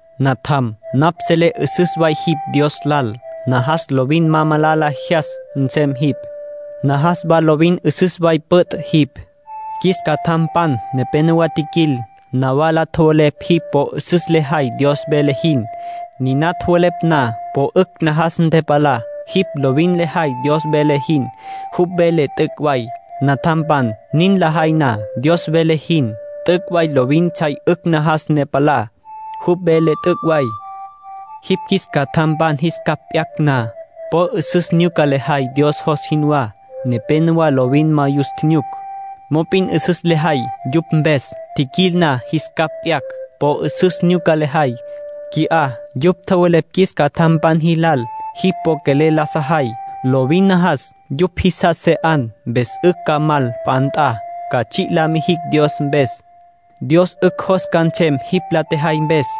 Natjam, napj selé 'üsüs way jipj Dios lal. Najas lovin ma malala jyas nsem jipj. Najas wa lovin 'üsüs way püt' jipj. Qjuis catjampan nepénowa tjiquil, nawala tjowelepj jipj po 'üsüs lejay Dios vele jin. Niná tjowelepj na, po 'ücj najas ntepalá. Jipj lovin lejay Dios vele jin. Jupj vele t'üc' way. Natjampan nin lajay na, Dios vele jin, t'üc' way lovin tsjay 'ücj najas ne palá. Jupj vele t'üc' way. Jipj qjuis catjampan jis capj p'yacj na, po 'üsüs nyuca lejay Dios jos jinwá. Nepénowa lovin ma yus tjinyuc. Mop'in 'üsüs lejay yupj mpes. Tjiquil na, jis capj p'yacj. Po 'üsüs nyuca lejay. Qui'á yupj tjowelepj qjuis catjampan jilal jipj po quelel la sajay. Lovin najas yupj jisas se 'an. Mpes 'ücj ca mal p'a nt'a, ca tsji' la mijicj Dios mpes. Dios 'ücj jos ca nsem jipj la tjejay mpes.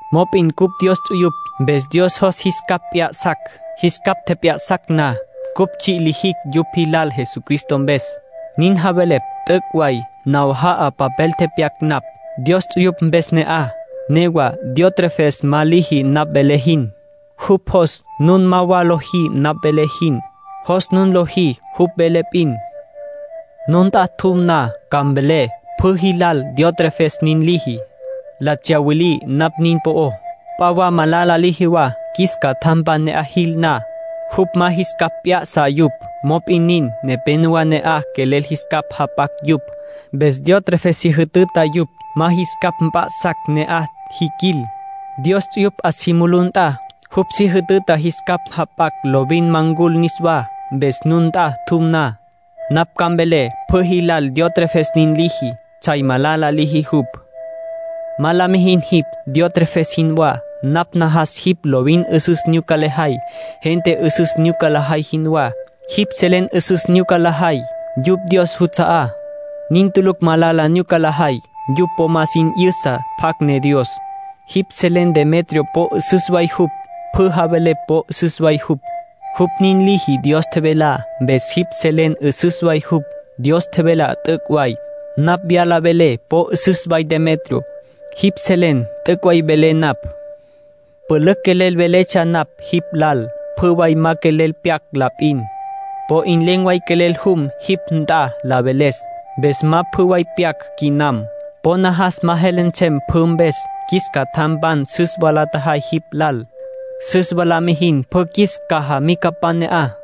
Mop'in cupj Dios ts'uyupj. Mpes Dios jos jis capj p'ya'sacj. Jis capj tjep'ya'sacj na, cupj tsji' lijicj yupj jilal Jesucristo mpes. Nin javelepj t'üc' way. Nawaja'a papel tepyac napj, Dios ts'uyupj mpes ne'aj. Newa Diótrefes ma liji napj velé jin. Jupj jos nun ma wa lojí napj velé jin. Jos nun lojí jupj vele p'in. Nun nt'a tjum na, ca mvelé pjü jilal Diótrefes nin liji. La tsyawilí napj nin po'ó. P'a wa malala liji wa. Qjuis catjampan ne'aj jil na, jupj ma jis capj p'ya'sa yupj. Mop'in nin, nepénowa ne'aj quelel jis capj jap'acj yupj. Mpes Diótrefes si jütüta yupj ma jis capj mp'a'sacj ne'aj jiquil. Dios ts'uyupj 'a si mulú nt'a, jupj si jütüta jis capj jap'acj lovin ma ncul niswá. Mpes nun nt'a tjum na, napj ca mvelé pjü jilal Diótrefes nin liji. Tsjay malala liji jupj. Ma la mijin jipj Diótrefes jinwá. Napj najas jipj lovin 'üsüs nyuca lejay, gente 'üsüs nyuca lajay jinwá. Jipj selen 'üsüs nyuca lajay, yupj Dios juts'a'á. Nin tulucj malala nyuca lajay. Yupj po ma sin tji'yüsa pjacj ne Dios. Jipj selen Demetrio po 'üsüs way jupj. Pjü javelepj po 'üsüs way jupj. Jupj nin liji Dios tjevelá, mpes jipj selen 'üsüs way jupj. Dios tjevelá t'üc' way. Napj wyala velé po 'üsüs way Demetrio. Jipj selen t'üc' way velé napj. Pülücj quelel veletsja napj jipj lal. Pjü way ma quelel pyac la p'in. Po 'in len̈ way quelel jum jipj nt'a la veles. Mpes ma pjü way pyac quinam. Po najas ma jele nsem pjü mpes. Qjuis cajamicapan süs wa la tjajay jipj lal. Süs wa la mijin pjü qjuis cajamicapan ne'aj.